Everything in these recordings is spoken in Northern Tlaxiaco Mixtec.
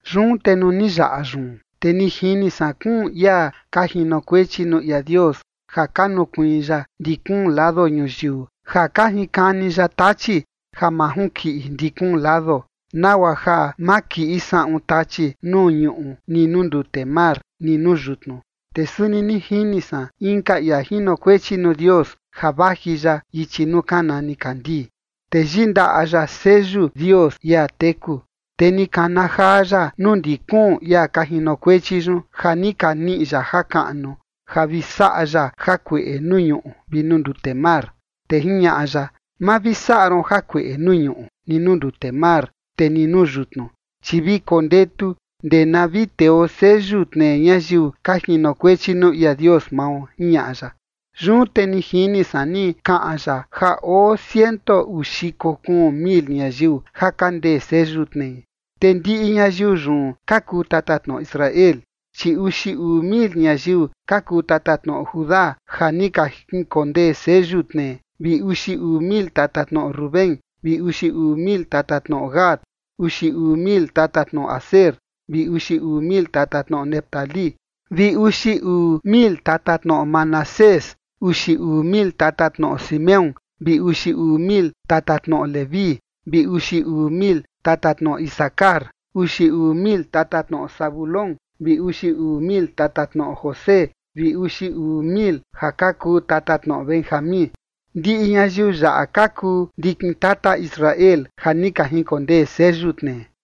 Yun te nuu ni yaꞌa yun, te ni jini san kuun ia ka jinokuechi nuu ia Dios ja ka nukuiin ya ndi kuun lado ñuyiu ja ka jinkani ya tachi ja ma junkiꞌi ndi kuun lado, nagua ja ma kiꞌi saꞌun tachi nuu ñuꞌu ni nuu ndute mar ni nuu yutnu. Te suni ni jini san inka ia jinokuechi nuu Dios ja vaji ya ichi nuu kana nikandii. Te yindaꞌa ya seyu Dios ia teku. Te ni kana jaa ya nuu ndi kuun ia ka jinokuechi yun ja ni ka niꞌi ya jakaꞌnu ja vi saꞌa ya jakueꞌe nuu ñuꞌu vi nuu ndute mar. Te jiñaꞌa ya: ―Ma vi saꞌa ron jakueꞌe nuu ñuꞌu, ni nuu ndute mar, te ni nuu yutnu, chi vi kondetu ndee na vi teo seyu tnee ñayiu ka jinokuechi nuu ia Dios mao ―jiñaꞌa ya. Yun te ni jini san ni kaꞌan ya ja oo ciento uu xiko kuun mil ñayiu ja ka ndee seyu tnei. Te ndiꞌi ñayiu yun ka kuu tatatnoꞌo Israel. Chi uxi uu mil ñayiu ka kuu tatatnoꞌo Judá ja ni ka jinkondee seyu tnee, vi uxi uu mil tatatnoꞌo Rubén, vi uxi uu mil tatatnoꞌo Gad. Uxi uu mil tatatnoꞌo Aser, vi uxi uu mil tatatnoꞌo Neftalí, vi uxi uu mil tatatnoꞌo Manasés. Uxi uu mil tatatnoꞌo Simeón, vi uxi uu mil tatatnoꞌo Leví, vi uxi uu mil tatatnoꞌo Isacar. Uxi uu mil tatatnoꞌo Zabulón, vi uxi uu mil tatatnoꞌo José vi uxi uu mil ja ka kuu tatatnoꞌo Benjamín. Ndiꞌi ñayiu yaꞌa ka kuu ndikin tata Israel ja ni ka jinkondee seyu tnee.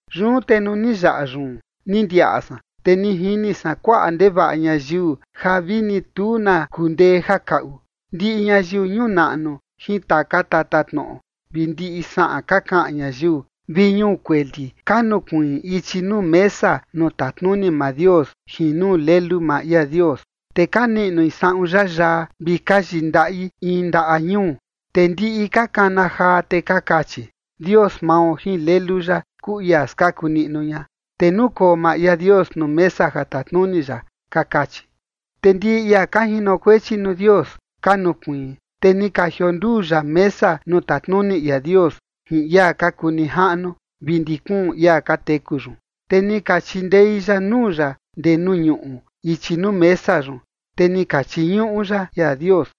Yun te nuu ni yaꞌa yun, ni ndiaꞌa san, te ni jini san kuaꞌa ndevaꞌa ñayiu, ja vini tu na kundee ja kaꞌu, ndiꞌi ñayiu ñuu naꞌnu jin taka tatatnoꞌo, vi ndiꞌi saꞌan ka kaꞌan ñayiu, vi ñuu kueli ka nukuiin ichi nuu mesa nuu tatnuni maa Dios jin nuu Lelu maa ia Dios. Te ka niꞌnui saꞌun yayaa vi ka yindaꞌi in ndaꞌa ñuu. Te ndiꞌi ka kana jaa, te ka kachi: Dios mao jin Lelu ya kuu ia skaku niꞌnu ña, te nukoo maa ia Dios nuu mesa ja tatnuni ya. Ka kachi. Te ndiꞌi ia ka jinokuechi nuu Dios ka nukuiin, te ni ka jionduu ya mesa nuu tatnuni ia Dios jin ia ka kuu nijaꞌnu vi ndi kuun ia ka teku yun. Te ni ka chindei ya nuu ya ndee nuu ñuꞌu ichi nuu mesa yun, te ni ka chiñuꞌu ya ia Dios.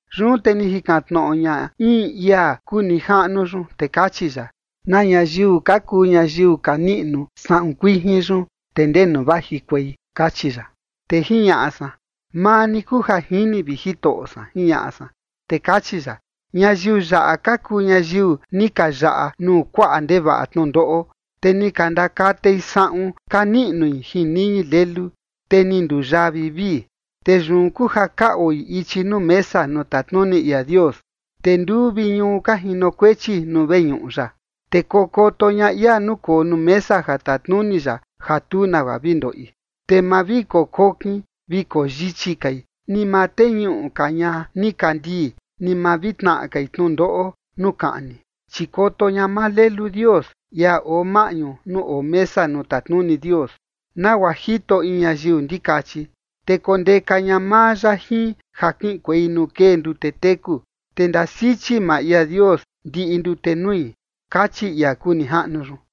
Yun te ni jikan tnoꞌo ña in ia kuu nijaꞌnu yun, te kachi ya: ―¿Na ñayiu ka kuu ñayiu ka niꞌnu saꞌun kuijin yun, te ndenu vajikuei? ―kachi ya. Te jiñaꞌa san: ―Maa ni kuu ja jini, vi Jitoꞌo san ―jiñaꞌa san. Te kachi ya: ―Ñayiu yaꞌa ka kuu ñayiu ni ka yaꞌa nuu kuaꞌa ndevaꞌa tnundoꞌo. Te ni ka ndakatei saꞌun ka niꞌnui jin niñi Lelu, te ni nduyaa vivii. Te yun kuu ja ka oi ichi nuu mesa nuu tatnuni ia Dios, te nduu vi ñuu ka jinokuechi nuu veñuꞌu ya. Te kokoto ña ia nukoo nuu mesa ja tatnuni ya ja tu nagua vi ndoꞌi. Te ma vi kokokin vi koyichi kai, ni ma teñuꞌu ka ña nikandii, ni ma vi tnaꞌa kai tnundoꞌo nuu kaꞌni. Chi koto ña maa Lelu Dios, ia oo maꞌñu nuu oo mesa nuu tatnuni Dios, nagua jito in ñayiu ndikachi. Te kondeka ña maa ya jin ja kiꞌinkuei nuu kee ndute teku. Te ndasichi maa ia Dios ndiꞌi ndute nui ―kachi ia kuu nijaꞌnu yun.